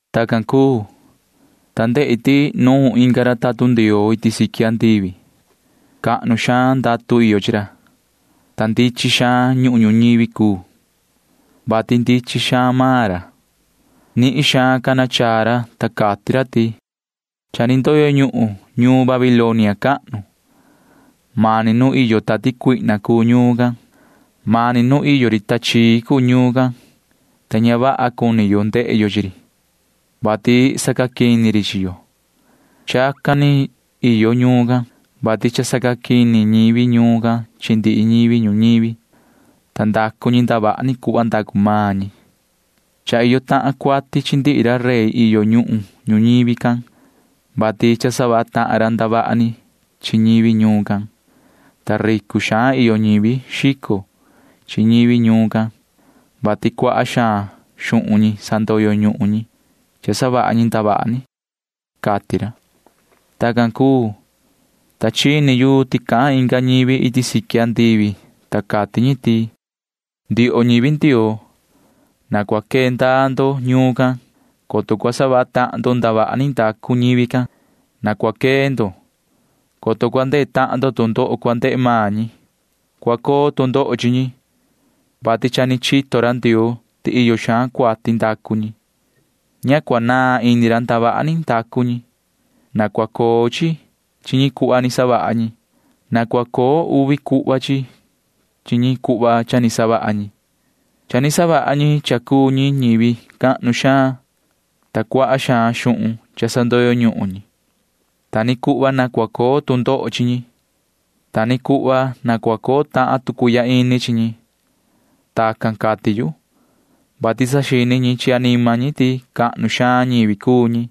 Tacan cuu, ta ndehi ti nuun inga ra tatun Ndioo iti siqui andivi. Cahnu xaan ndatu iyo chi ra, ta ndichin xaan ñuhun ñuñivi cuu, vati ndichin xaan maan ra. Nihin xaan cana chaa ra, ta cati ra ti: ―Cha ni ndoyo ñuhun ñuun Babilonia cahnu. Mani nu iyo tati cuihna iyo ñuun can. Mani nu iyo ri tachii iyo ñuun can, ta ña vaha cuni yo ndehe yo chi ri, vati sacaquini ri chi yo. Chacan ni iyo ñuun can, vati cha sacaquini ñivi ñuun can chi ndihi ñivi ñuñivi, ta ndacu ñi ndavaha ni cuhva ndacu maan ñi. Cha iyo tahan cuati ndihi ra rey iyo nu ñuhun ñuñivi, vati cha savaha tahan ra ndavaha ni chi ñivi ñuun can. Ta ricu xaan iyo ñivi xico chi ñivi ñuun can, vati cuaha xaan xuhun ñi sandoyo ñuhun ñi cha savaha ñi ndavaha ni ―cati ra. Tacan cuu, ta chini yu ti cahan inga ñivi iti siqui andivi, ta cati ñi ti: ―Ndioho ñivi Ndioo, na cua quee ndaa ndo ñuun can, coto cua savaha tahan ndo ndavaha ni ndacu ñivi can. Na cua quee ndo, coto cua ndehe tahan ndo tu ndoho cua ndehe maan ñi. Cua coo tu ndoho chi ñi, vati cha ni chito ra Ndioo ti iyo xaan cuati ndacu ñi. Ña cua naan ini ra ndavaha ni ndacu ñi. Na cua coo chi chi ñi cuhva ni savaha ñi. Na cua coo uvi cuhva chi ñi cuhva cha ni savaha ñi. Cha ni savaha ñi cha cuu ñi ñivi cahnu xaan, ta cuaha xaan xuhun cha sandoyo ñuhun ñi. Ta ni cuhva na cua coo tu ndoho chi ñi. Ta ni cuhva na cua coo tahan tu cuihya ini chi ñi. Tacan cati yu, vati saxini ñi chi anima ñi ti cahnu xaan ñivi cuu ñi.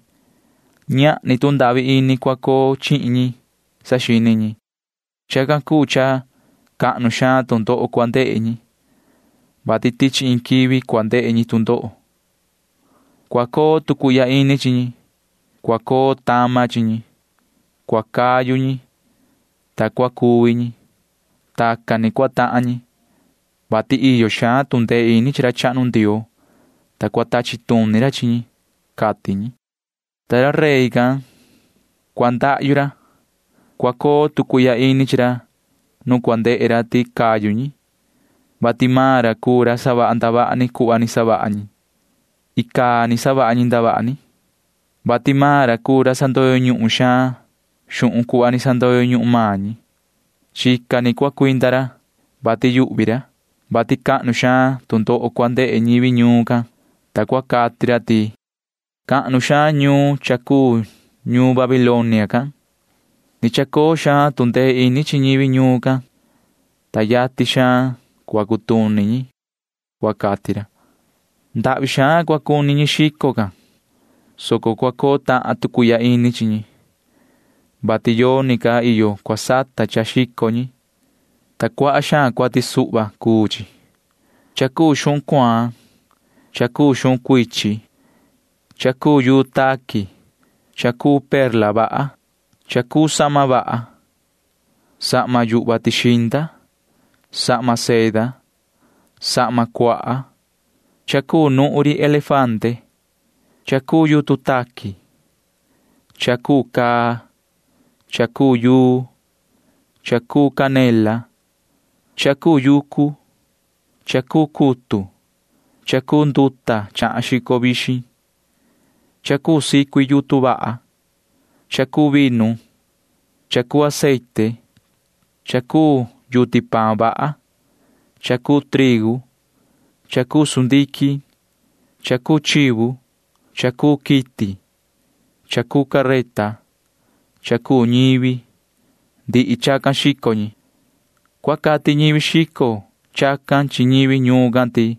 Ñahni tu ndahvi ini cua coo chihin ñi, saxini ñi. Chacan cuu cha cahnu xaan tu ndoho cua ndehe ñi, vati tichi iin quivi cua ndehe ñi tu ndoho. Cua coo tu cuihya ini chi ñi. Cua coo tama chi ñi. Cua cayu ñi, ta cua cuvi ñi. Tacan ni cua tahan ñi, vati iyo xaan tu ndee ini chi ra chahnu Ndioo, ta cua tachi tuni ra chi ñi ―cati ñi. Ta ra rey can―cua ndahyu ra. Cua coo tu cuihya ini chi ra nu cua ndehe ra ti cayu ñi, vati maan ra cuu ra savaha ndavaha ni cuhva ni savaha ñi. Icaa ni savaha ñi ndavaha ni, vati maan ra cuu ra sandoyo ñuhun xaan xuhun cuhva ni sandoyo ñuhun maan ñi. Chica ni cua cuinda ra, vati yuhvi ra, vati cahnu xaan tu ndoho cua ndehe ñivi ñuun can, ta cua cati ra ti: ―Cahnu xaan ñuun cha cuu ñuun Babilonia can. Ni chacoo xaan tu ndee ini chi ñivi ñuun can, ta yatin xaan cua cutuni ñi ―cua cati ra. Ndahvi xaan cua cuni ñi xico can, soco cua coo tahan tu cuihya ini chi ñi, vati yoni ca iyo cua sata cha xico ñi, ta cuaha xaan cuati suhva cuu chi. Cha cuu xuhun cuaan, cha cuu xuhun cuichin, cha cuu yuu taqui, cha cuu perla vaha, cha cuu sahma vaha, sahma yuhva tixinda, sahma seda, sahma cuaha, cha cuu yutun chahan xico vixin, cha cuu nuhun ri elefante, cha cuu yutun taqui, cha cuu caa, cha cuu yuu, cha cuu canela, cha cuu yucu, cha cuu cutu, cha cuu nduta chahan xico vixin, cha cuu sicui yutun vaha, cha cuu vinu, cha cuu aceite, cha cuu yuti paan vaha, cha cuu trigu, cha cuu sundiquin, cha cuu chivu, cha cuu quiti, cha cuu careta, cha cuu ñivi―ndihi chacan xico ñi. Cua cati ñivi xico chacan chi ñivi ñuun can ti: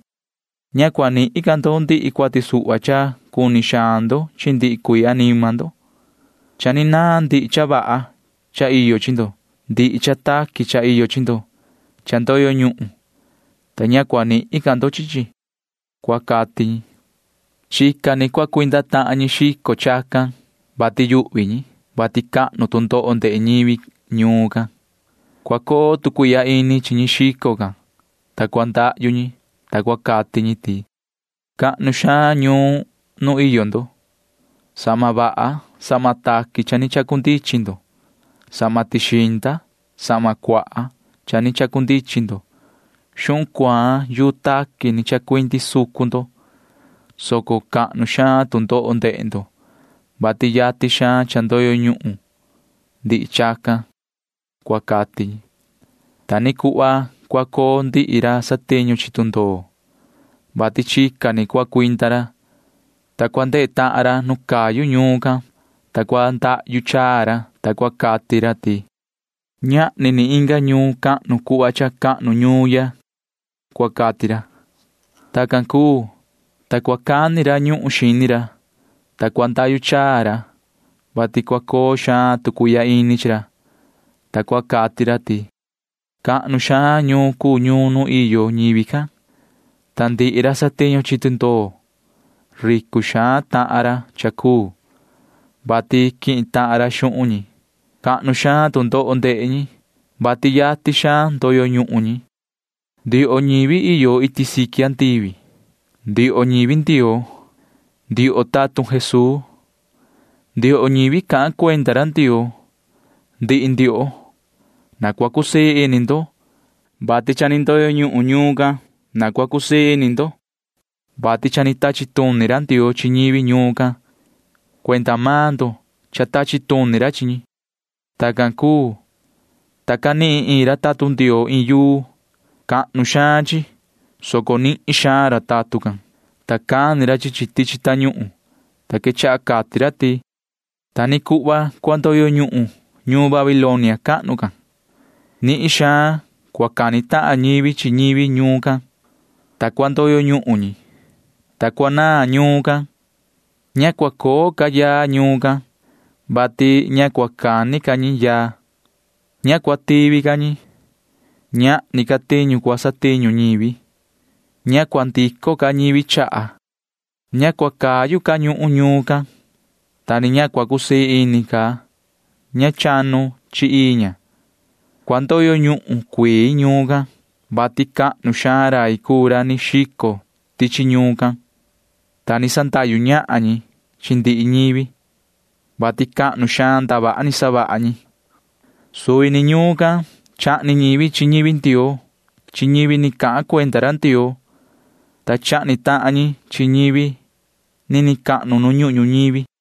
―Ña cua nihin ca ndo ndihi cuati suhva cha cuni xaan ndo chi ndihi cuii anima ndo. Cha ni naan ndihi cha vaha cha iyo chi ndo. Ndihi cha taqui cha iyo chi ndo cha ndoyo ñuhun, ta ña cua nihin ca ndo chi chi ―cua cati ñi. Chica ni cua cuinda tahan ñi xico chacan, vati yuhvi ñi, vati cahnu tu ndoho ndehe ñivi ñuun can. Cua coo tu cuihya ini chi ñi xico can, ta cua ndahyu ñi, ta cua cati ñi ti: ―Cahnu xaan ñuun nu iyo ndo. Sahma vaha sahma taqui cha ni chacundichin ndo. Sahma tixinda sahma cuaha cha ni chacundichin ndo. Xuhun cuaan yuu taqui ni chacuindi sucun ndo, soco cahnu xaan tu ndoho ndehe ndo, vati yatin xaan cha ndoyo ñuhun ndihi chacan ―cua cati ñi. Ta ni cuhva cua coo ndihi ra satiñu chi tundoo, vati chica ni cua cuinda ra. Cua ndehe tahan ra nu cayu ñuun can, ta cua ndahyu chaa ra, ta cua cati ra ti: ―Ñahni ni inga ñuun cahnu cuhva cha cahnu ñuun ya ―cua cati ra. Tacan cuu, ta cua cani ra ñuhun xini ra, ta cua ndahyu chaa ra, vati cua coo xaan tu cuihya ini chi ra, ta cua cati ra ti: ―Cahnu xaan ñuun cuu ñuun nu iyo ñivi can, ta ndihi ra satiñu chi tundoo―ricu xaan tahan ra cha cuu, vati quihin tahan ra xuhun ñi. Cahnu xaan tu ndoho ndehe ñi, vati yatin xaan ndoyo ñuhun ñi ―cua cati ra. Ndioho ñivi iyo iti siqui andivi, ndioho ñivi Ndioo, ndioho tatun Jesuu, ndioho ñivi cahan cuenda ra Ndioo, ndihi ndioho―na cua cusii ini ndo, vati cha ni ndoyo ñuhun ñuun can. Na cua cusii ini ndo, vati cha ni tachi tuni ra Ndioo chi ñivi ñuun can. Cuenda maan ndo cha tachi tuni ra chi ñi. Tacan cuu, ta canihin iin ra tatun Ndioo iin yuu. Cahnu xaan chi ni cuu, soco nihin suhva ra tatun can, ta cani ra chi chi tichi tañuhun, ta quechaha cati ra ti: ―Ta ni cuhva cua ndoyo ñuhun ñuun Babilonia cahnu can. Nihin xaan cua cani tahan ñivi chi ñivi ñuun can, ta cua ndoyo ñuhun ñi, ta cua naan ñuun can. Ña cua coo ca yaa ñuun can, vati ña cua cani ca ñi yaa. Ña cua tivi ca ñi. Ñahni ca tiñu cua satiñu ñivi. Ña cua ndico ca ñivi chaha. Ña cua cayu ca ñuhun ñuun can, ta ni ña cua cusii ini ca ña chanu chi ii ña. Cua ndoyo ñuhun cuii ñuun can, vati cahnu xaan rai cuu ra ni xico tichi ñuun can, ta ni sandahyu ñahan ñi chi ndihi ñivi, vati cahnu xaan ndavaha ni savaha ñi ―cati ra. Suvi ni ñuun can chahni ñivi chi ñivi Ndioo chi ñivi ni cahan cuenda ra Ndioo, ta chahni tahan ñi chi ñivi nini cahnu nu ñuhun ñuñivi.